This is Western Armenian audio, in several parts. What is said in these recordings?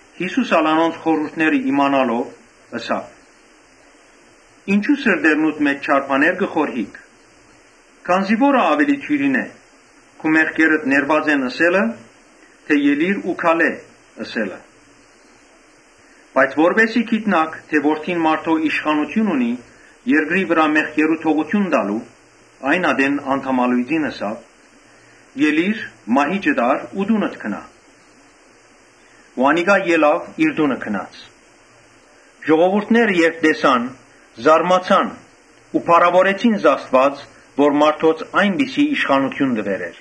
Յիսուս անոնց խորհուրդները իմանալով՝ ըսաւ. «Ինչո՞ւ սրտներուդ մէջ չար բաներ կը խորհիք։ Ո՞րը աւելի դիւրին է. ‘Քու մեղքերդ ներուած են՝ ըսե՞լը, թէ ելիր ու քալէ՝ ըսելը’։ Բայց որպէսզի գիտնաք թէ Որդին մարդոյ իշխանութիւն ունի երկրի վրայ մեղքերու թողութիւն տալու (այն ատեն անդամալոյծին ըսաւ), «Ելի՛ր, մահիճդ ա՛ռ ու տունդ գնա»։ Անիկա ելաւ իր տունը գնաց։ Ներկաները երբ տեսան, զարմացան ու փառաւորեցին Աստուած, որ մարդոց այնպիսի իշխանութիւն տուեր է։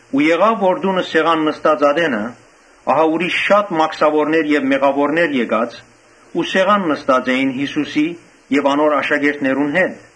Տունը սեղան նստած ատենը՝ ահա ուրիշ շատ մաքսաւորներ եւ մեղաւորներ եկած ու սեղան նստած էին Յիսուսի եւ անոր աշակերտներուն հետ։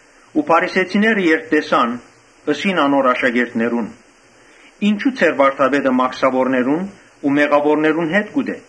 Փարիսեցիները երբ տեսան, ըսին անոր աշակերտներուն. «Ինչո՞ւ ձեր վարդապետը մաքսաւորներու ու մեղաւորներու հետ կ’ուտէ»։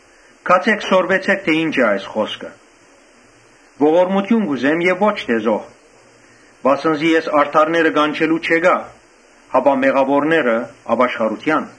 Գացէ՛ք, սորվեցէք թէ ի՛նչ է այս խօսքը. ‘Ողորմութիւն կ’ուզեմ եւ ո՛չ թէ զոհ’. վասն զի ես արդարները կանչելու չեկայ, հապա մեղաւորները Ոմանք չունինապաշխարութեան»։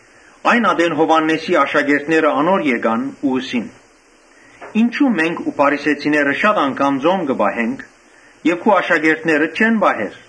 Այն ատեն Յովհաննէսին աշակերտները անոր եկան ու ըսին. «Ինչո՞ւ մենք ու փարիսեցիները շատ անգամ ծոմ կը պահենք, իսկ քու աշակերտներդ չեն պահեր»։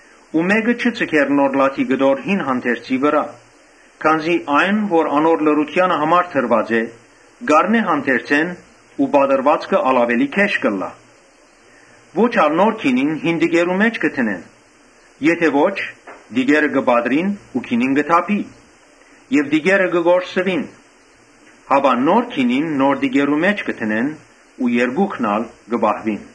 Մէկը չի ձգեր նոր լաթի կտոր մը հին հանդերձի մը վրայ, քանզի այն որ անոր լրութեանը համար դրուած է, կ’առնէ հանդերձէն ու պատռուածքը աւելի գէշ կ’ըլլայ. Ո՛չ ալ նոր գինին հին տիկերու մէջ կը դնեն. քանի որ տիկերը կը պատռին ու գինին կը թափի եւ տիկերը կը կորսուին. հապա նոր գինին նոր տիկերու մէջ կը դնեն ու երկուքն ալ կը պահուին»։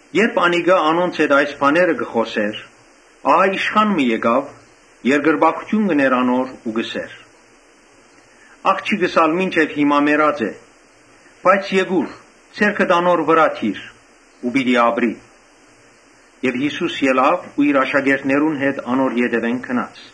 Երբ անիկա անոնց հետ այս բաները կը խօսէր, ահա իշխան մը եկաւ, երկրպագութիւն կ’ընէր անոր ու կ’ըսէր. «Աղջիկս թերեւս մինչեւ հիմա մեռած է, բայց եկուր ձեռքդ անոր վրայ դիր ու պիտի ապրի»։ Յիսուս ելաւ ու իր աշակերտներուն հետ անոր ետեւէն գնաց։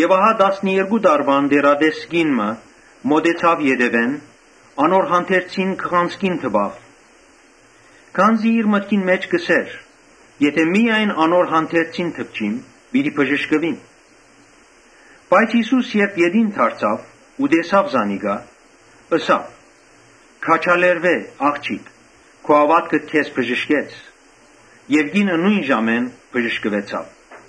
Ահա տասներկու տարուան տեռատես կին մը մօտեցաւ ետեւէն, անոր հանդերձին քղանցքին դպաւ. Քանզի իր մտքին մէջ կ’ըսէր. «Միայն անոր հանդերձին դպչիմ, պիտի բժշկուիմ»։ Յիսուս երբ ետին դարձաւ ու տեսաւ զանիկա, ըսաւ. «Քաջալերուէ՛, ա՛ղջիկ, քու հաւատքդ քեզ բժշկեց»։ Կինը նոյն ժամուն բժշկուեցաւ։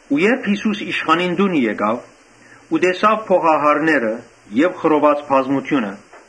Երբ Յիսուս իշխանին տունը հասաւ, տեսաւ փողահարները եւ խռոված բազմութիւնը,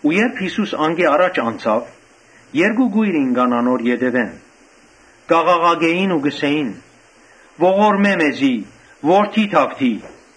Երբ Յիսուս անկէ յառաջ անցաւ, երկու կոյր ինկան անոր ետեւէն, կ’աղաղակէին ու կ’ըսէին. «Ողորմէ՛ մեզի, Դաւիթի՛ Որդի»։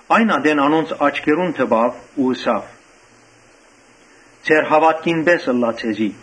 Այն ատեն անոնց աչքերուն դպաւ ու ըսաւ. «Ձեր հաւատքին պէս ըլլայ ձեզի»։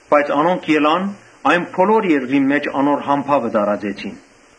Բայց անոնք ելան, այն բոլոր երկրին մէջ անոր համբաւը տարածեցին։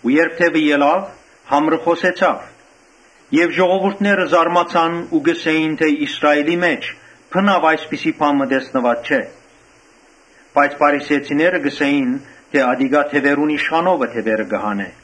Երբ դեւը ելաւ, համրը խօսեցաւ։ Եւ ժողովուրդը զարմացաւ ու կ’ըսէին թէ՝ Իսրայէլի մէջ բնաւ այսպիսի բան տեսնուած չէր։ Բայց փարիսեցիները կ’ըսէին. «Ատիկա դեւերուն իշխանութիւնովը դեւեր կը հանէ»։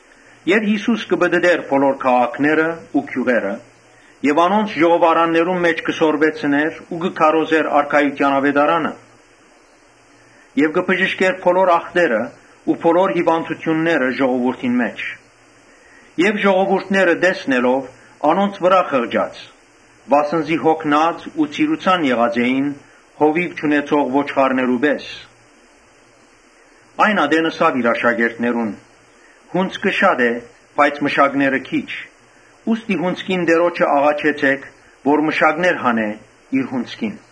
Յիսուս կը պտըտէր բոլոր քաղաքներն ու գիւղերը եւ անոնց ժողովարաններուն մէջ կը սորվեցնէր ու կը քարոզէր արքայութեան աւետարանը եւ կը բժշկէր բոլոր ախտերն ու բոլոր հիւանդութիւնները ժողովուրդին մէջ։ Ժողովուրդները տեսնելով, անոնց վրայ խղճաց, վասն զի յոգնած ու ցիրուցան եղած էին հովիւ չունեցող ոչխարներու պէս։ Այն ատեն ըսաւ իր աշակերտներուն. «Հունձքը շատ է, բայց մշակները՝ քիչ, Ուստի հունձքին Տէրոջը աղաչեցէք, որ մշակներ հանէ իր հունձքին»։